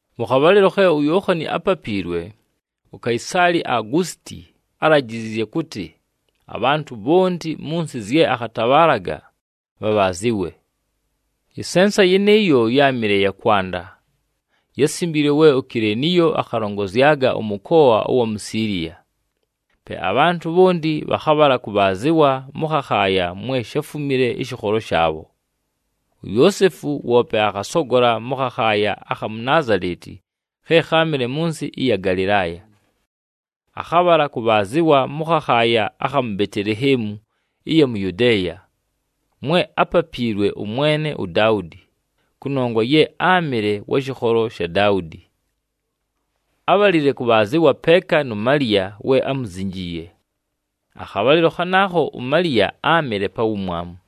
Mʉ khabhalɨlo khe uYookhani ápapiilwe, uKaisaali Augusiti álajiziizye kʉtɨ, abhantʉ bhonti mʉ nsɨ zye akhatabhaalaga, bhabhaazɨwe. Ɨsensa yɨnɨɨyo ye yáamɨle ya kwanda, yásimbiilwe we uKileniyo akhalongozyaga ʉmʉkoa ʉwa mu Siiliya. Pe abhantʉ bhonti bhakhabhala kʉbhaazɨwa mʉ khakhaaya mwe sháfumile ɨshɨkholo shaabho. UYoosefu woope akhasogola mʉ khakhaaya akha mu Naazaleti khe kháamɨle mʉ nsɨ ɨya Galɨlaaya. Akhabhala kʉbhaazɨwa mʉ khakhaaya akha mu Beteleheemu ɨya mu Yudeeya, mwe ápapiilwe ʉmwene uDaudi, kʉnongwa ye áamɨle wa shɨkholo sha Daudi. Ábhalile kʉbhaazɨwa peeka nu Maliya we ámuzinjiiye. Akhabhalɨlo khanaakho uMaliya áamɨle pa wumwamu.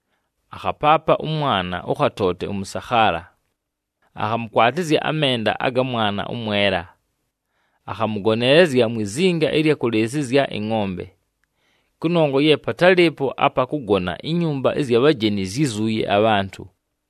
Akhapaapa ʉmwana ʉkhatoote ʉmʉsakhaala, akhamʉkwatɨzya amenda aga mwana ʉmwela. Akhamʉgoneelezya mwi zinga ɨlya kʉlɨɨsɨzya ɨngʼombe, kʉnongwa ye patálɨɨpo apa kʉgona, inyumba ɨzya bhajeni zyízuuye abhantʉ.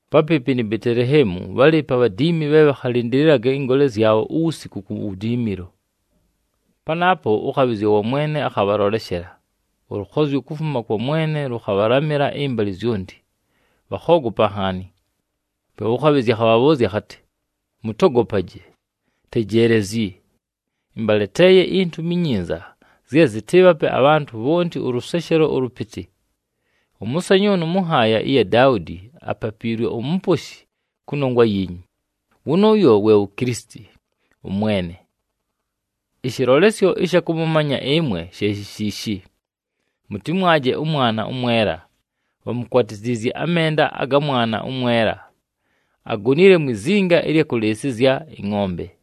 Papɨɨpɨ ni Beteleheemu bhálɨɨpo abhadiimi bhe bhakhalɨndɨlɨlaga ɨngoole zyabho uwusiku ku wudiimilo. Panaapo ʉkhabhɨzya wa Mwene akhabhaloleshela, ʉlʉkhozyo kufuma kwa Mwene lʉkhabhalamɨla ɨmbalɨ zyonti, bhakhoogopa nhaani. Pe ʉkhabhɨzya akhabhabhʉʉzya akhatɨ, “Mʉtogopaje! Tejeelezyi, ɨmbaleteeye intumi inyinza zye zɨtɨɨbhape abhantʉ bhonti ʉlʉseshelo ʉlʉpɨtɨ. Ʉmʉsanyʉʉnʉ mʉ nhaaya ya Daudi apapiilwe uMuposhi kʉnongwa yiinyu, wʉnʉʉyo we wu Kilisiti, ʉMwene. Ɨshɨlolesyo ɨsha kʉmʉmanya ɨmwe she shi shiishi: mʉtɨmwaje ʉmwana ʉmwela, bhamukwatiziizye amenda aga mwana ʉmwela, agonile mwi zinga ɨlya kʉlɨɨsɨzya ɨngʼombe.”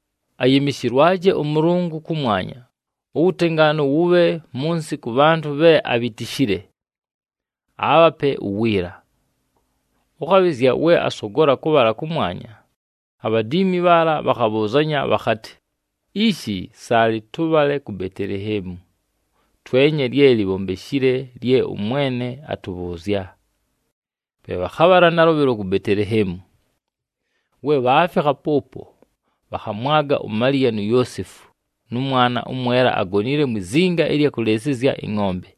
“Ayɨmɨshɨlwaje ʉMʉlʉngʉ kʉmwanya, uwutengaanu wʉbhe mʉ nsɨ kʉ bhantʉ bhe abhitishile, aabhape uwiila.” Ʉkhabhɨzya we asogola kʉbhala kʉmwanya, abhadiimi bhaala bhakhabhʉʉzanya bhakhatɨ, “Ishi saalɨ tʉbhale ku Beteleheemu, twenye lye libhombeshile lye ʉMwene atʉbhʉʉzya.” Pe bhakhabhala nalʉbhɨlo ku Beteleheemu. We bhaafikha pʉʉpo, bhakhamwaga uMaliya nu Yoosefu, nʉ mwana ʉmwela agonile mwi zinga ɨlya kʉlɨɨsɨzya ɨngʼombe.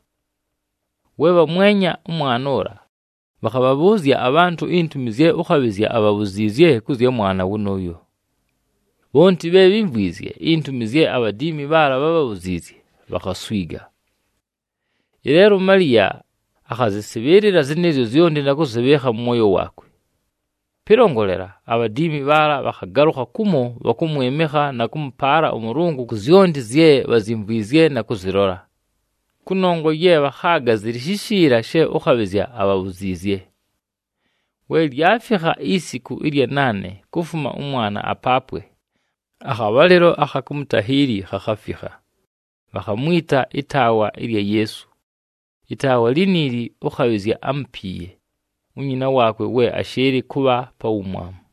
We bhamwenya ʉmwana ʉla, bhakhabhabhʉʉzya abhantʉ intumi zye ʉkhabhɨzya abhabhuziizye kʉ zya mwana wʉnʉʉyo. Bhonti bhe bhímvwizye intumi zye abhadiimi bhaala bhábhabhuziizye, bhakhaswiga. Ɨleelo, uMaliya akhazɨsɨbhɨɨlɨla zɨnɨɨzyo zyonti na kʉzɨbhɨɨkha mʉ mwoyo waakwe. Pɨlongolela, abhadiimi bhaala bhakhagalʉkha kumo bhakʉmwɨmɨkha na kʉmʉpaala ʉMʉlʉngʉ ku zyonti zye bhazyimvwizye na kʉzɨlola, kʉnongwa ye bhakhaaga zɨlɨ shishiila she ʉkhabhɨzya abhabhuziizye. We lyafikha isiku ɨlya naane kufuma ʉmwana apaapwe, akhabhalɨlo akha kumutahiili khakhafikha, bhakhamwita ɨtaawa ɨlya Yeesu. Ɨtaawa liniili ʉkhabhɨzya ámupiiye, unyina waakwe we ashɨɨlɨ kʉbha pa wumwamu.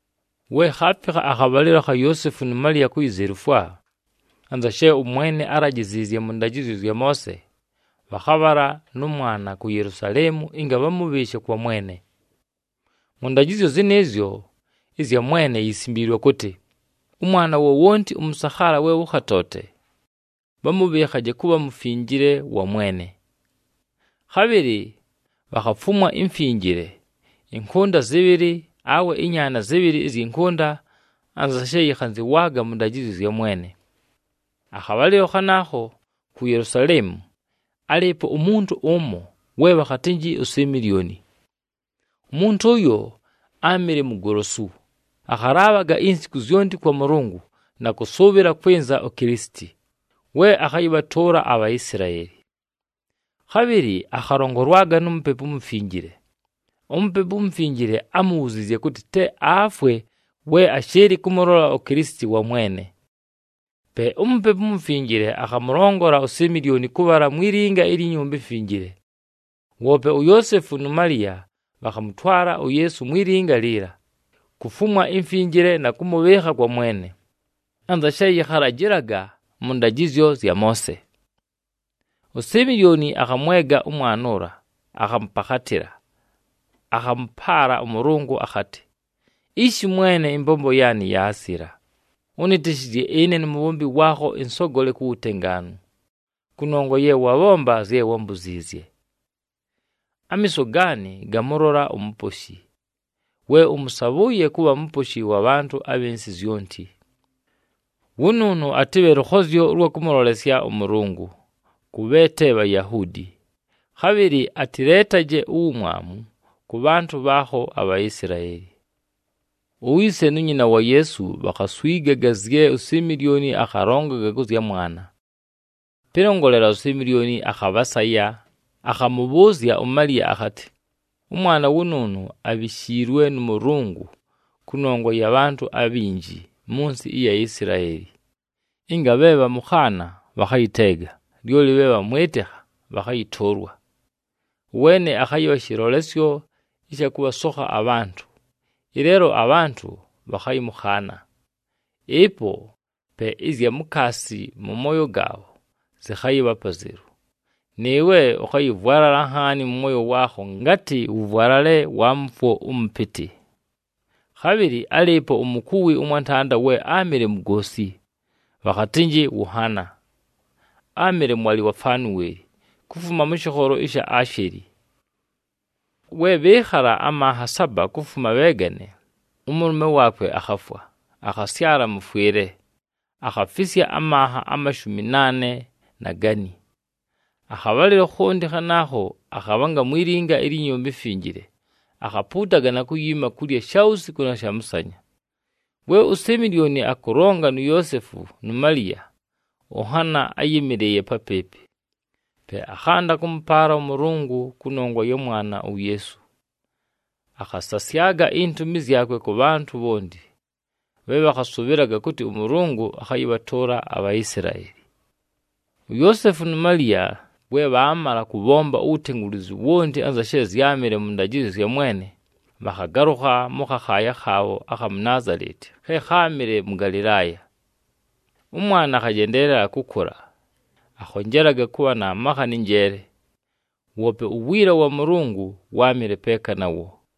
We khaafikha akhabhalɨlo akha Yoosefu nu Maliya kuyizelufwa, anza she ʉMwene álajiziizye mʉ ndajɨzyo zya Moose, bhakhabhala nʉ mwana ku Yelusaleemu ɨnga bhamʉbhɨɨshe kwa Mwene. Mʉ ndajɨzyo zɨnɨɨzyo ɨzya Mwene yisimbiilwe kʉtɨ, “Ʉmwana wowonti ʉmʉsakhaala we wʉkhatoote, bhamʉbhɨɨkhaje kʉbha mufinjile wa Mwene.” Khabhɨlɨ bhakhafumwa imfinjile, ɨnkʉnda zɨbhɨlɨ awe ɨnyaana zɨbhɨlɨ ɨzyɨ nkʉnda anza she yɨkhanzɨwaaga mʉ ndajɨzyo zya Mwene. Akhabhalɨlo khanaakho ku Yelusaleemu, álɨɨpo umuntu ʉmo we bhakhatɨnjɨ uSimilyoni. Umuntu ʉyo áamɨle mugolosu, akhalaabhaga insiku zyonti kwa Mʉlʉngʉ na kʉsʉʉbhɨla kwɨnza uKilisiti, we akhayɨbhatʉʉla aBhaisilaeli. Khabhɨlɨ akhalongolwaga nu Mupepu uMufinjile. UMupepu uMufinjile ámubhuziizye kʉtɨ te afwe we ashɨɨlɨ kʉmʉlola uKilisiti wa Mwene. Pe uMupepu uMufinjile akhamʉlongola uSimilyoni kʉbhala mwi linga ilyi Nyumba iMfinjile. Woope uYoosefu nu Maliya bhakhamʉtwala uYeesu mwi linga liila, kufumwa imfinjile na kʉmʉbhɨɨkha kwa Mwene, anza she yɨkhalajɨlaga mʉ ndajɨzyo zya Moose. USimilyoni akhamwega ʉmwana ʉla akhamʉpakhatɨla, akhamʉpaala ʉMʉlʉngʉ akhatɨ, “Ishi Mwene, ɨmbombo yaanɨ yaasila, ʉnɨtɨshɨzye ɨne numubhombi waakho ɨnsogole ku wutengaanu, kʉnongwa ye wabhomba zye wámbuziizye. Amiiso gaanɨ gamʉlola uMuposhi, we ʉmʉsabhʉʉye kʉbha Muposhi wa bhantʉ abhɨ nsɨ zyonti. Wʉnʉʉnʉ atɨbhe lʉkhozyo ʉlwa kʉmʉlolesya ʉMʉlʉngʉ kʉ bhe te Bhayahuudi, khabhɨlɨ atɨleetaje uwumwamu kʉ bhantʉ bhaakho aBhaisilaeli.” Uyise nu nyina wa Yeesu bhakhaswigaga zye uSimilyoni akhalongaga kʉ zya mwana. Pɨlongolela, uSimilyoni akhabhasaya, akhamʉbhʉʉzya uMaliya akhatɨ, “Ʉmwana wʉnʉʉnʉ abhishiilwe nʉ Mʉlʉngʉ kʉnongwa ya bhantʉ abhinji mʉ nsɨ ɨya Isilaeli, ɨnga bhe bhamʉkhaana bhakhayɨteega, lyoli bhe bhamwɨtɨkha bhakhayɨtʉʉlwa. Ʉweene akhayɨbha shɨlolesyo ɨsha kʉbhasokha abhantʉ, ɨleelo abhantʉ bhakhayɨmʉkhaana. Ɨpo pe ɨzya mukaasi mʉ mooyo gaabho zɨkhayɨbha apazelu. Nɨɨwe, ʉkhayɨvwalala nhaani mʉ mwoyo waakho, ngatɨ wʉvwalale wa mʉfwo ʉmʉpɨtɨ.” Khabhɨlɨ álɨɨpo umukuwi ʉmwantanda we áamɨle mugoosi, bhakhatɨnjɨ ʉHana. Áamɨle mwalɨ wa Fanweli kufuma mʉ shɨkholo sha Asheli. We bhɨɨkhala amanha saba kufuma bheegane, ʉmʉlʉme waakwe akhafwa. Akhasyala mʉfwɨle, akhafisya amanha amashumi naane na gani. Akhabhalɨlo khonti khanaakho akhabhanga mwi linga ilyi Nyumba iMfinjile, akhapuutaga na kuyiima kulya shawusiku na shamʉsanya. We uSimilyoni akʉlonga nu Yoosefu nu Maliya, ʉHana áyɨmɨlɨɨye papɨɨpɨ. Pe akhanda kʉmʉpaala ʉMʉlʉngʉ kʉnongwa ya mwana uYeesu, akhasasyaga intumi zyakwe kʉ bhantʉ bhonti bhe bhakhasʉbhɨlaga kʉtɨ ʉMʉlʉngʉ akhayɨbhatʉʉla aBhaisilaeli. UYoosefu nu Maliya we bhaamala kʉbhomba uwutengulizu wonti anza she zyámɨle mʉ ndajɨzyo zya Mwene, bhakhagalʉkha mʉ khakhaaya khaabho akha mu Naazaleti khe kháamɨle mʉ Galɨlaaya. Ʉmwana akhajendeelela kʉkʉla, akhonjelaga kʉbha na makha nɨ njeele, woope uwiila wa Mʉlʉngʉ wáamɨle peeka nawo.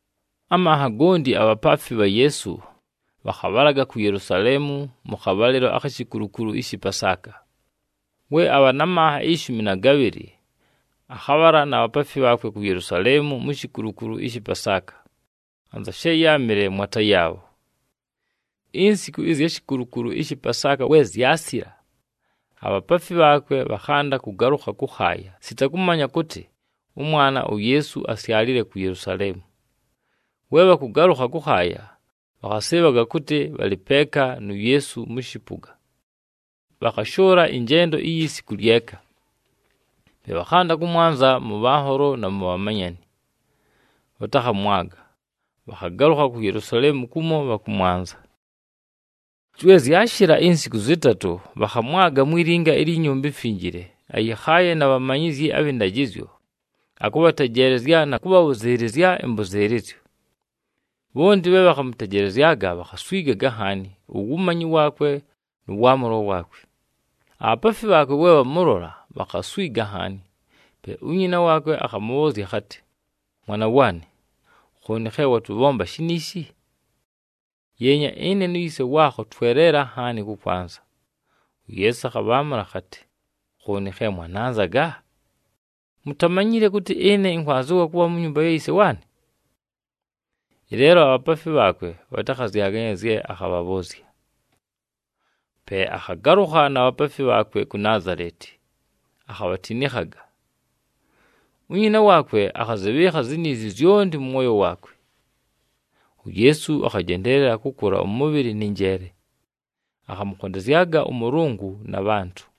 Amanha gonti abhapaafi bha Yeesu bhakhabhalaga ku Yelusaleemu mʉ khabhalɨlo akhi shikulukulu ɨshɨ Pasaaka. We abha na manha ishumi na gabhɨlɨ, akhabhala na bhapaafi bhaakwe ku Yelusaleemu mu shikulukulu ɨshɨ Pasaaka, anza she yáamɨle mwata yaabho. Insiku ɨzya shikulukulu ɨshɨ Pasaaka we zyasila, abhapaafi bhaakwe bhakhanda kʉgalʉkha kʉkhaaya sita kʉmanya kʉtɨ, ʉmwana uYeesu asyalile ku Yelusaleemu. We bhakʉgalʉkha kʉkhaaya, bhakhasɨɨbhaga kʉtɨ, bhalɨ peeka nu Yeesu mʉ shɨpʉga, bhakhashʉʉla ɨnjendo iyi siku lyeka. Pe bhakhanda kʉmwanza mʉ bhanholo na mu bhamanyani, bhatakhamwaga, bhakhagalʉkha ku Yelusaleemu kumo bhakʉmwanza. We zyashɨla insiku zɨtatʉ, bhakhamwaga mwi linga ilyi Nyumba iMfinjile, ayɨkhaaye na bhamanyizyi abhɨ ndajɨzyo, akʉbhatejeelezya na kʉbhabhʉzɨɨlɨzya ɨmbʉzɨɨlɨzyo. Bhonti bhe bhakhamʉtejelezyaga, bhakhaswigaga nhaani uwumanyi waakwe nʉ waamʉlo waakwe. Abhapaafi bhaakwe we bhamʉlola, bhakhaswiga nhaani. Pe unyina waakwe akhamʉbhʉʉzya akhatɨ, “Mwana waanɨ, khooni khe watʉbhomba shiniishi? Yeenya! Ɨne nu yise waakho tweleela nhaani kʉkwanza.” UYeesu akhabhaamʉla akhatɨ, “Khooni khe mwananzaga? Mutamanyile kʉtɨ ɨne ɨnkwanzɨwa kʉbha mu nyumba ya yise waanɨ?” Ɨleelo abhapaafi bhaakwe bhatakhazyaganya zye akhabhabhʉʉzya. Pe akhagalʉkha na bhapaafi bhaakwe ku Naazaleti, akhabhatinikhaga. Unyina waakwe akhazɨbhɨɨkha ziniizi zyonti mʉ mwoyo waakwe. UYeesu akhajendeelela kʉkʉla ʉmʉbhɨlɨ nɨ njeele, akhamʉkhondezyaga ʉMʉlʉngʉ na bhantʉ.